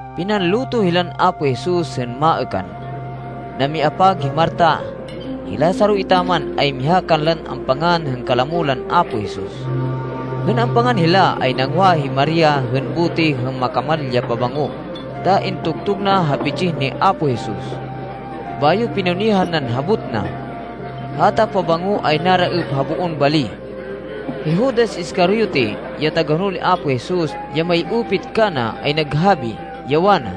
Pinanluto hilan Apo Jesus hên maêkan. Namiapag hi Marta. Hi Lazaro etaman, ay miha kanlan ampangan hên kalamo lan Apo Jesus. Hên ampangan hila, ay nangwa hi Maria hên bote hên makamal ya pabango ta intugtug na ha bitsih ni Apo Jesus. Bayo, pinunihan nan habot na. Hata pabango ay naraêp ha boon bali. Hi Judas Iscariote, ya tagahonol ni Apo Jesus ya may-upit kana, ay naghabi, ya wana,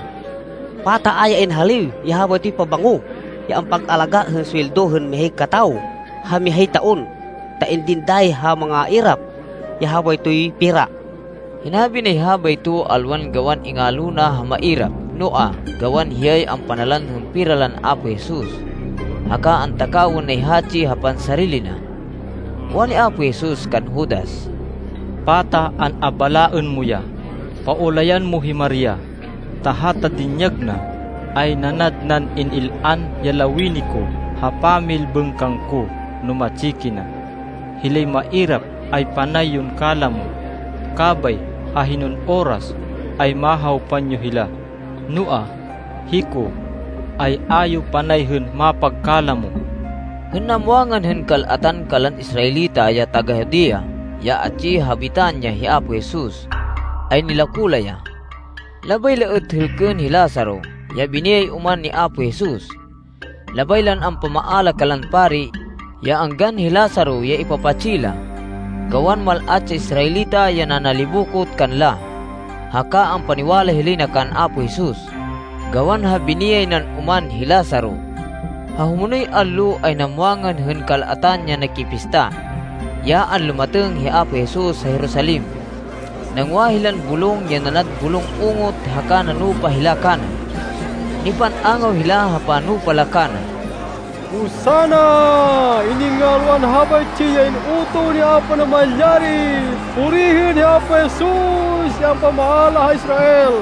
“Pata a ya inhaliw ya habaytoy pabango, ya ampag-alaga hên suweldo hên mihay katawo ha mihay taon, ta indin dayi ha mangairap ya habaytoy pera?” Hinabi nay habayto, alwan gawan ingalo na ha mairap, noa, gawan hiyay ampanalan hên pera lan Apo Jesus, haka antakawên nay hatsi ha pansarili na. Wani Apo Jesus kan Judas, “Pata an-abalaên mo ya! Paulayan mo hi Maria, ta hata dinyag na, ay nanad nan in-il-an ya lawini ko ha pamilbêng kangko no matsi kina. Hilay mairap ay panay yon kalamo, kabay ha hinon oras, ay mahawpan yo hila, noa, hiko ay a yo panay hên mapagkalamo.” Hên namwangan hên kal-atan kanlan Israelita ya taga-Judea, ya atsi ya ha Betania hi Apo Jesus, ay nilako la ya. Labay la êt hêlkên hi Lazaro, ya biniyay oman ni Apo Jesus. Labay lan ampamaala kanlan pari, ya anggan hi Lazaro ya ipapatsi la, gawan mal-at ya Israelita ya nanalibokot kanla, haka ampaniwala hilay na kan Apo Jesus, gawan ha biniyay nan oman hi Lazaro. Ha humonoy allo, ay namwangan hên kal-atan ya nakipista, ya anlumatêng hi Apo Jesus ha Jerusalem. Nangwa hilan bulong, ya nanad bulong ongot haka nanupa hila kana. Nipan-angaw hila ha panupa la kana, “Hosanna! Iningalwan ya habaytsi ya in-utoh ni Apo Namalyari! Puriên hi Apo Jesus ya ampamaala ha Israel!”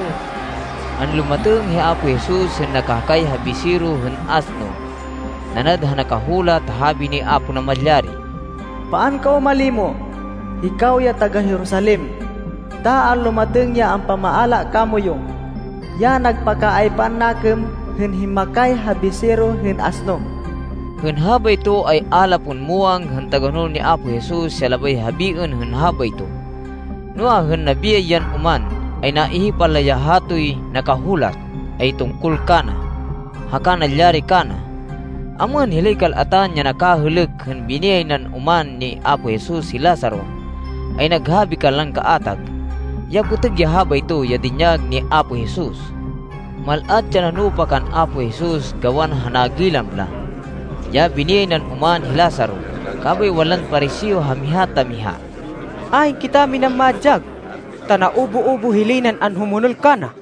Anlumatêng hi Apo Jesus hên nakahakay ha bisero hên asno nanad ha nakahulat ha habi ni Apo Namalyari: “Paan kaw malimo, hikaw ya taga-Jerusalem, ta anlumatêng ya ampamaala kamoyu, ya nagpakaaypan nakêm hên himmakay ha bisero hên asno!” Hên habayto ay a la pon muwang hên tagahonol ni Apo Jesus ya labay habiên hên habayto. Noa, hên nabiyay yan oman, ay naihipan la ya hatoy nakahulat, ay tungkol kana, haka nalyari kana. Amêhên, hilay kal-atan ya nakahêlêk hên biniyay nan oman ni Apo Jesus hi Lazaro, ay naghabi kanlan kaatag, ya pêtêg ya habayto ya dinyag ni Apo Jesus. Mal-at ya nanupa kan Apo Jesus gawan ha nagilam la, ya biniyay nan oman hi Lazaro. Kabay wanlan Pariseo ha miha ta miha, “Ayn kitaminan madyag ta naubuh-ubuh hilay nan anhumonol kana.”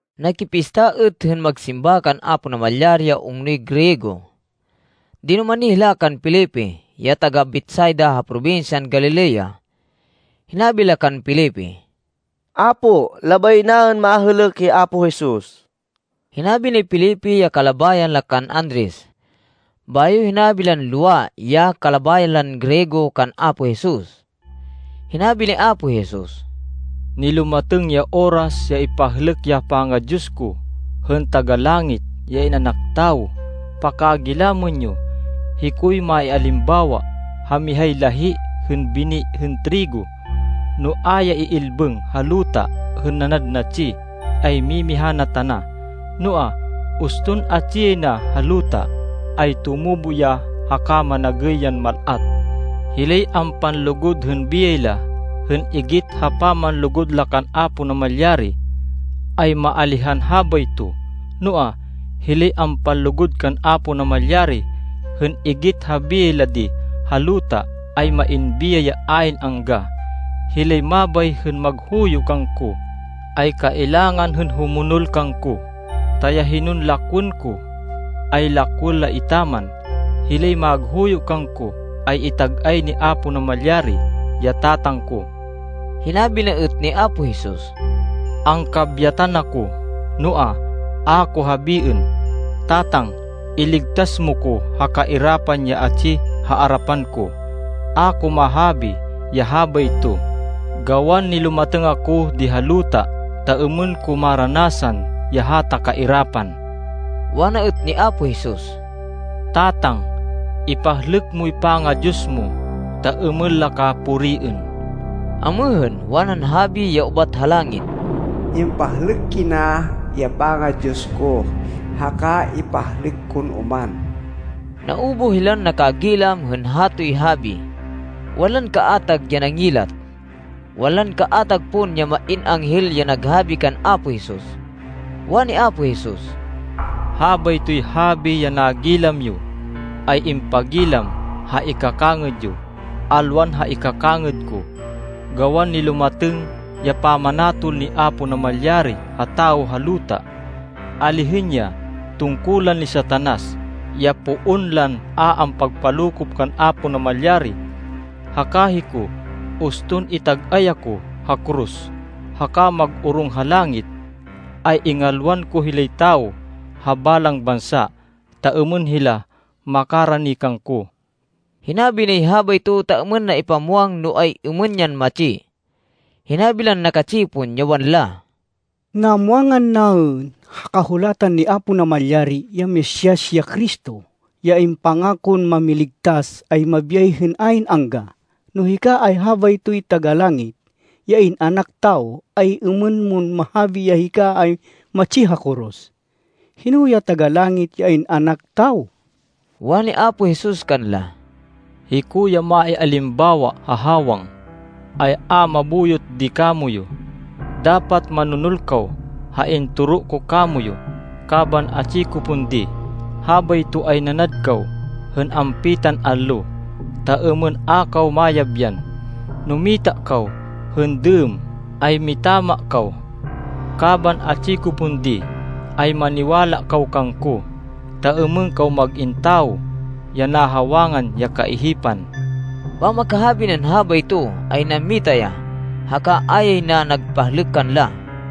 Nakipista êt hên magsimba kan Apo Namalyari ya ungnoy Griego. Dinumani hila kan Felipe, ya taga-Betsaida ha probinsyan Galilea. Hinabi la kan Felipe, “Apo, labay naên mahêlêk hi Apo Jesus.” Hinabi ni Felipe ya kalabayan la kan Andres. Bayo hinabi lan lowa ya kalabayan lan Griego kan Apo Jesus. Hinabi ni Apo Jesus, “Nilumatêng ya oras ya ipahlêk ya panga-Diyos ko, hên Taga-Langit, ya In-anak Tawo. Pakagilamên yo, hikoy maialimbawa ha mihay lahí hên bini hên trigo. No a ya iilbêng ha luta hên nanad natsi, ay mimiha na tana. Noa, uston atsi yay na ha luta, ay tumubo ya haka managêy yan mal-at. Hilay ampanlugud hên biyay la hên igit ha pamanlugud la kan Apo Namalyari, ay maalihan habayto. Noa, hilay ampanlugud kan Apo Namalyari hên igit ha biyay la di ha luta, ay main biyay ya ayn angga. Hilay mabay hên maghuyo kangko, ay kailangan hên humonol kangko, ta ya hinon lakwên ko, ay lakwên la etaman. Hilay maghuyo kangko ay itag-ay ni Apo Namalyari, ya Tatang ko.” Hinabi na êt ni Apo Jesus, “Angkabyatan ako. Noa, a ko habiên, ‘Tatang, iligtas mo ko ha kairapan ya atsi ha arapan ko.’ A ko mahabi ya habayto, gawan nilumatêng ako di ha luta, ta êmên ko maranasan ya hata kairapan.” Wana êt ni Apo Jesus, “Tatang, ipahlêk moy panga-Diyos mo, ta êmên la ka puriên.” Amêhên, wanan habi ya ubat ha langit, “Impahlêk kina ya panga-Diyos ko, haka ipahlêk kon oman.” Naubuh hilan nakagilam hên hatoy habi. Wanlan kaatag ya nangilat. Wanlan kaatag pon ya main anghel ya naghabi kan Apo Jesus. Wani Apo Jesus, “Habaytoy habi ya nagilam yo ay impagilam ha ikakangêd yo, alwan ha ikakangêd ko. “Gawan nilumatêng ya pamanatol ni Apo Namalyari ha tawo ha luta. Alihên ya tungkulan ni Satanas, ya poon lan a ampagpalokop kan Apo Namalyari. Haka hiko, uston itag-ay ako ha koros, haka mag-orong ha langit, ay ingalwan ko hilay tawo ha balang bansa ta êmên hila makarani kangko.” Hinabi nay habayto ta êmên na ipamwang no ay-êmên yan matsi. Hinabi lan naka-tsipon, ya wanla, “Namwangan naên ha Kahulatan ni Apo Namalyari, ya Mesias, ya Cristo, ya impangakon Mámiligtas ay mabiyay hên ayn angga. No hika ay habaytoy Taga-Langit, ya In-anak Tawo, ay-êmên mon mahabi ya hika ay matsi ha koros? Hino ya Taga-Langit, ya In-anak Tawo?” Wani Apo Jesus kanla, “Hiko ya maialimbawa ha hawang, ay a magbuyot di kamoyu. Dapat manonol kaw ha intoro ko kamoyu kaban atsi ko pon di. Habayto ay nanad kaw hên ampitan allo, ta êmên a kaw mayabyan. No mita kaw hên dêmm ay mitama kaw. Kaban atsi ko pon di, ay maniwala kaw kangko ta êmên kaw mag-in tawo ya nahawangan ya kaihipan.” Pamakahabi nan habayto, ay nammita ya haka a yay na nagpahlêk kanla.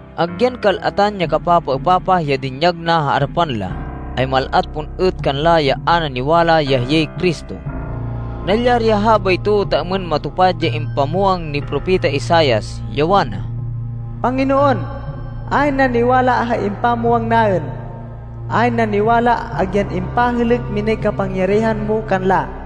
Agyan kal-atan ya kapapaêpapah ya dinyag na ha arapan la, ay mal-at pon êt kanla ya a naniwala ya hiyay Cristo. Nalyari ya habayto ta êmên matupad ya impamwang ni Propeta Isaias, ya wana: “Panginoon, ayn naniwala ha impamwang naên. Ayn naniwala agyan impahêlêk minay kapangyarihan mo kanla.”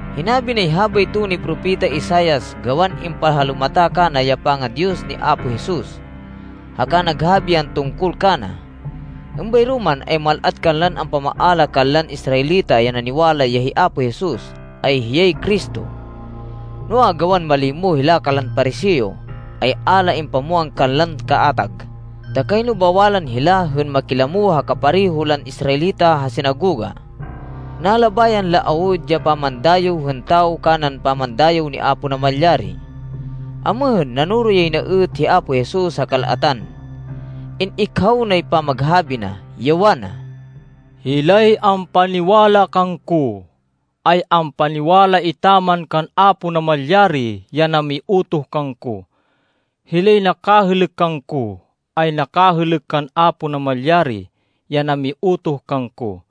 Hinabi nay habayto ni Propeta Isaias gawan impahalumata kana ya panga-Diyos ni Apo Jesus. Haka naghabi yan tungkol kana. Êmbayro man, ay mal-at kanlan ampamaala kanlan Israelita ya naniwala ya hi Apo Jesus, ay hiyay Cristo. Noa, gawan malimo hila kanlan Pariseo, ay a la impamwang kanlan kaatag, ta kayno bawalan hila hên makilamo ha kapareho lan Israelita ha sinagoga. Nalabayan la awud ya pamandayêw hên tawo kanan pamandayêw ni Apo Namalyari. Amêhên, nanoro yay na êt hi Apo Jesus ha kal-atan. In-ikhaw nay pamaghabi na, ya wana, “Hilay ampaniwala kangko, ay ampaniwala etaman kan Apo Namalyari ya namiutoh kangko. Hilay nakahêlêk kangko ay nakahêlêk kan Apo Namalyari, ya namiutoh kangko.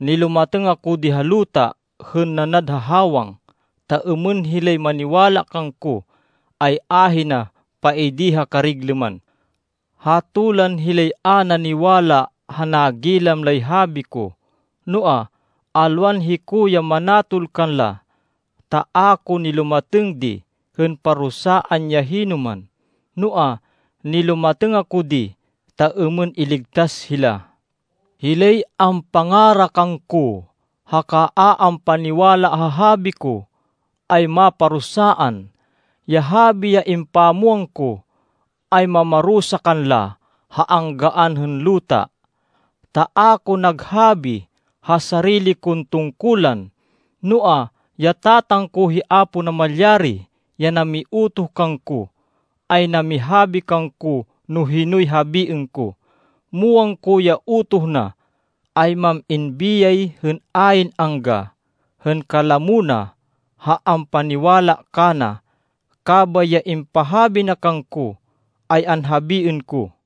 Nilumatêng ako di ha luta hên nanad ha hawang, ta êmên hilay maniwala kangko ay ahina paidi ha kariglêman. Hatolan hilay a naniwala ha nagilam lay habi ko, noa, alwan hiko ya manatol kanla, ta a ko nilumatêng di hên parusaan ya hinoman. Noa, nilumatêng ako di ta êmên iligtas hila. Hilay ampangara kangko, haka a ampaniwala ha habi ko ay maparusaan. Ya habi ya impamwang ko ay mamarusa kanla ha anggaan hên luta. Ta a ko naghabi ha sarili kon tungkulan, noa, ya Tatang ko hi Apo Namalyari ya namiutoh kangko ay namihabi kangko no hinoy habiên ko. Muwang ko ya utoh na, ay mam-in biyay hên ayn angga hên kalamo na, ha ampaniwala kana. Kabay ya impahabi na kangko ay anhabiên ko.”